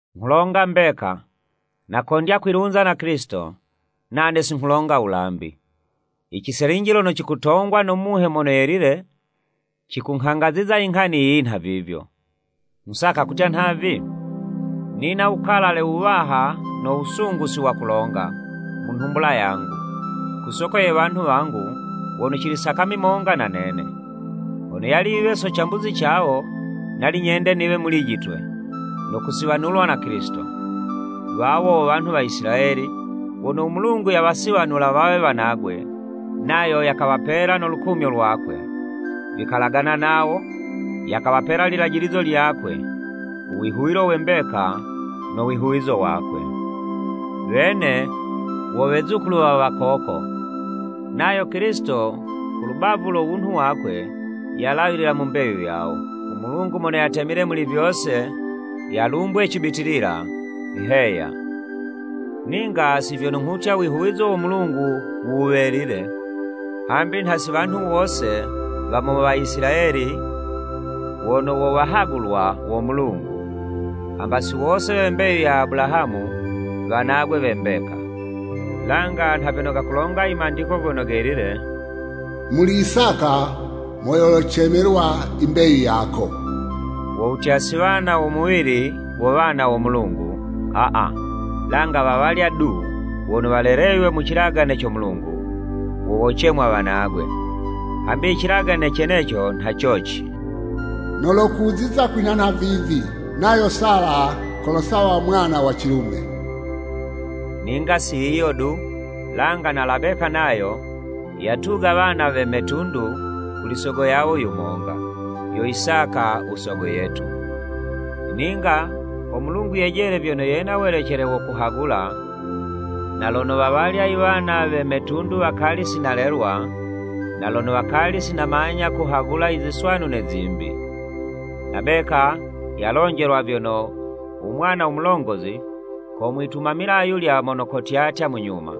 Nghulonga mbeka, nakondya kwilunza na Kilisito, nane si nghulonga wulambi. Iciselinji lono cikutongwa no Muhe Mono Yelile, cikunghangaziza inghani yiyi nhavivyo. Nghusaka kutya nhavi. Ninga wukalale wuwaha, no wusungu si wakulonga, mu nhumbula yangu, ku soko ye wanhu wangu, wono cili sakami monga na nene! Hono yali yiwe so cambuzi cawo, nali nyende niwe mulijitwe, no kusiwanulwa na Kilisito. Wawo wo wanhu wa Isilayeli, wono u Mulungu yawasiwanula wawe wanagwe, nayo yakawapela no lukumyo lwakwe, vikalagana nawo, yakawapela lilajilizo lyakwe, wihuwilo we mbeka no wihuwizo wakwe. Wene wo wezukulu we wakoko, nayo Kilisito ku lubavu lo wunhu wakwe, yalawilila mu mbeyu yawo. U Mulungu mono yatemile muli vyose, yalumbwe cibitilila, Heya. Ninga si vyono nghutya, uwihuwizo wo Mulungu wuwelile, hambi nha si wanhu wose wa mu Waisilayeli, wono wo wahagulwa wo Mulungu. Hamba si wose we mbeyu ya Abulahamu, wanagwe we mbeka. Langa nha vyono gakulonga i Mandiko Gono Gelile. “Muli Isaka mo yolocemelwa imbeyu yako.” Wo wutya, si wana wo muwili wo wana wo Mulungu aa, langa wawalya du, wono waleleywe mu cilagane co Mulungu, wo wocemwa wanagwe. Hambi icilagane ceneco nha coci. “Nolokuziza kwinha nhavivi, nayo Sala kolosawa mwana wa cilume.” Ninga si yiyo du, langa na Labeka nayo, yatuga wana we metundu kuli sogo yawo yumonga, yo Isaka u Sogo yetu. Ninga ho Mulungu yejele vyono yena welecele wo kuhagula, na lono wawalya iwana we metundu wakali si nalelwa, na lono wakali si namanya kuhagula iziswanu ne zimbi. Labeka yalonjelwa vyono, u mwana mulongozi komwitumamila ayulya mono kotyatya mu nyuma.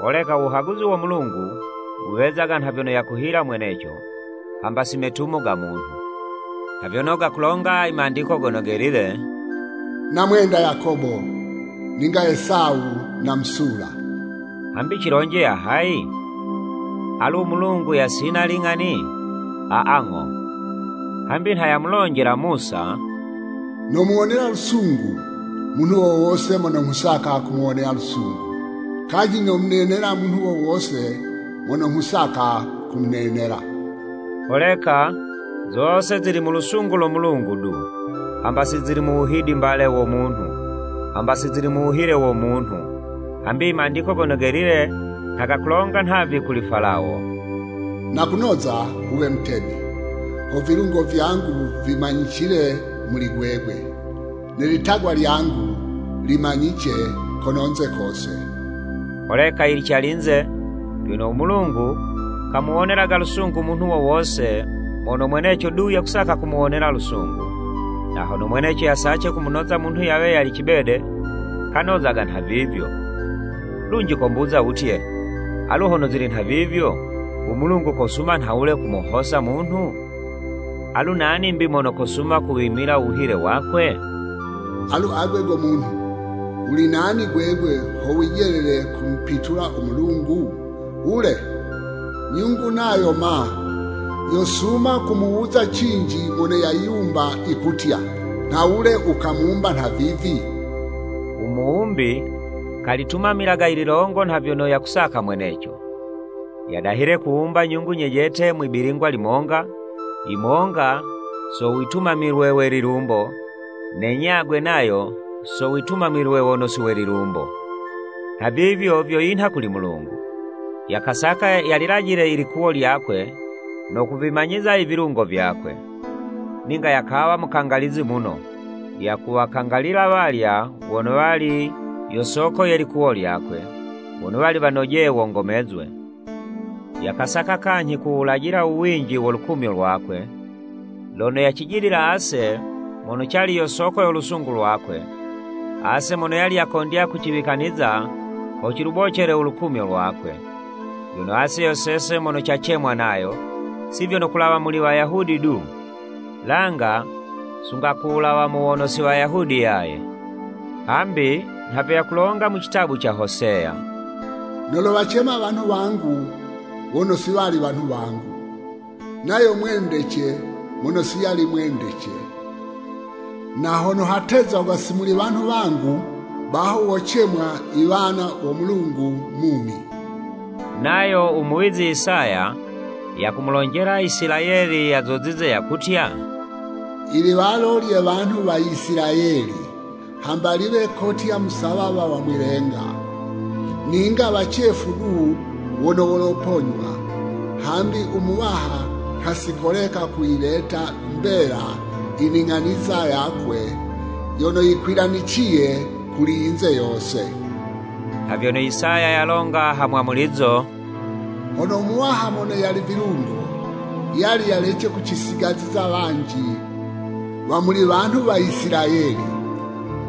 Holeka u wuhaguzi wo Mulungu, wuwezaga nha vyono yakuhila mweneco, hamba si metumo ga munhu. Nha vyono gakulonga i Mandiko Gono Gelile, “Namwenda Yakobo, ninga Esawu namusula.” Hambi cilonje ya hayi? Alu u Mulungu yasina iling'ani? Aa ng'o! Hambi nha yamulonjela Musa, “Nomuwonela lusungu munhu wo wose mono nghusaka kumuwonela lusungu, kanyhi nomunenela munhu wo wose mono nghusaka kumunenela.” Holeka zose zili mu lusungu lo Mulungu du, hamba si zili mu wuhidimbale wo munhu, hamba si zili mu wuhile wo munhu. Hambi i Mandiko Gono Gelile nha gakulonga nhavi kuli Falawo, “Nakunoza wuwe mutemi, ho vilungo vyangu vimanyicile muli gwegwe, ne litagwa lyangu limanyice kononze kose.” Holeka yili calinze, vyono u Mulungu kamuwonelaga lusungu munhu wo wose mono mweneco du yakusaka kumuwonela lusungu, na hono mweneco yasace kumunoza munhu yawe yali cibede, kanozaga nhavivyo. Lunji kombuza wutye, “Alu hono zili nhavivyo, u Mulungu kosuma nhawule kumuhosa munhu? Alu nani 'mbi mono kosuma kuwimila u wuhile wakwe?” Alu agwe go munhu, wuli nani gwegwe ho wijelele kumupitula u Mulungu? Wule, nyungu nayo ma, yosuma kumuwuza cinji mono yayiwumba yikutya, “Nhawule wukamumba nhavivi?” U muwumbi kalitumamilaga ililongo nha vyono yakusaka mweneco, yadahile kuwumba nyungu nyejete mwi'bilingwa limonga, yimonga so witumilwe we lilumbo, ne nyagwe nayo so witumilwe wono si we lilumbo. Nhavivyo vyo yinha kuli Mulungu. Yakasaka yalilajile ilikuwo lyakwe, no kuvimanyiza ivilungo vyakwe. Ninga yakawa mukangalizi muno, yakuwakangalila walya wono wali yo soko ye likuwo lyakwe, wono wali wanojeye wongomezwe. Yakasaka kanyhi kuwulajila u winji wo lukumyo lwakwe, lono yacijidila ase mono cali yo soko yo lusungu lwakwe, ase mono yali yakondya kuciwikaniza ho cilubocele u lukumyo lwakwe. Vyono ase yo sese mono cacemwa nayo, si vyono kulawa muli Wayahudi du, langa sunga ku wulawa mu wono si Wayahudi yaye. Hambi nha vyo yakulonga mu citabu ca Hoseya: “Nolowacema, ‘wanhu wangu,’ Wono si wali wanhu wangu. Nayo ‘Mwendece,’ mono si yali mwendece! Na hono hatezagwa ‘Si muli wanhu wangu!’ Baho wocemwa I Wana wo Mulungu mumi!” Nayo u muwizi Isaya, yakumulonjela Isilayeli yazozize, yakutya, “Iliwalo lye wanhu wa Isilayeli, hamba liwe kotya musawawa wa mwi'lenga, ninga wacefu du wono woloponywa, hambi u Muwaha nha si koleka kuyileta mbela i ning'aniza yakwe yono yikwilaniciye kuli yinze yose.” Nha vyono Isaya yalonga ha mwamulizo, “Hono u Muwaha mono yali vilungo, yali yalece kucisigaziza wanji wa muli wanhu wa Isilayeli,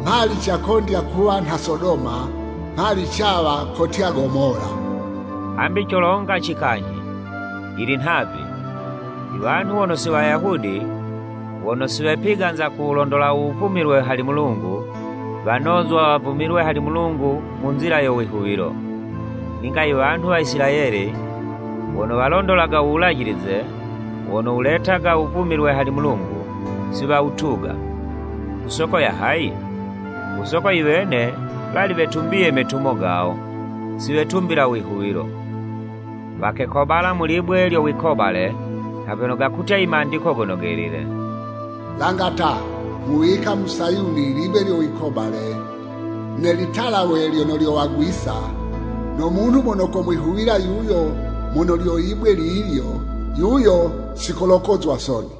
mhali cakondya kuwa nha Sodoma, mhali cawa kotya Gomola.” Hambi colongaci kanyhi? Yili nhavi: iwanhu wono si Wayahudi wono si wepiganza kuwulondola u wuvumilwe hali Mulungu, wanozwa wavumilwe hali Mulungu mu nzila yo wihuwilo. Ninga i wanhu wa Isilayeli wono walondolaga u wulajilize, wono wuletaga u wuvumilwe hali Mulungu, si wawutuga. Ku soko ya hayi? Ku soko i wene wali wetumbiye metumo gawo, siwetumbila u wihuwilo. Wakekobala mu libwe lyo wikobale, nha vyono gakutya i Mandiko Gono Gelile: “Langa ta, nghuwika mu Sayuni, libwe lyo wikobale, Ne litalawe lyono lyowagwisa! No munhu mono komwihuwila yuyo mono lyo libwe lilyo, yuyo si kolokozwa soni.”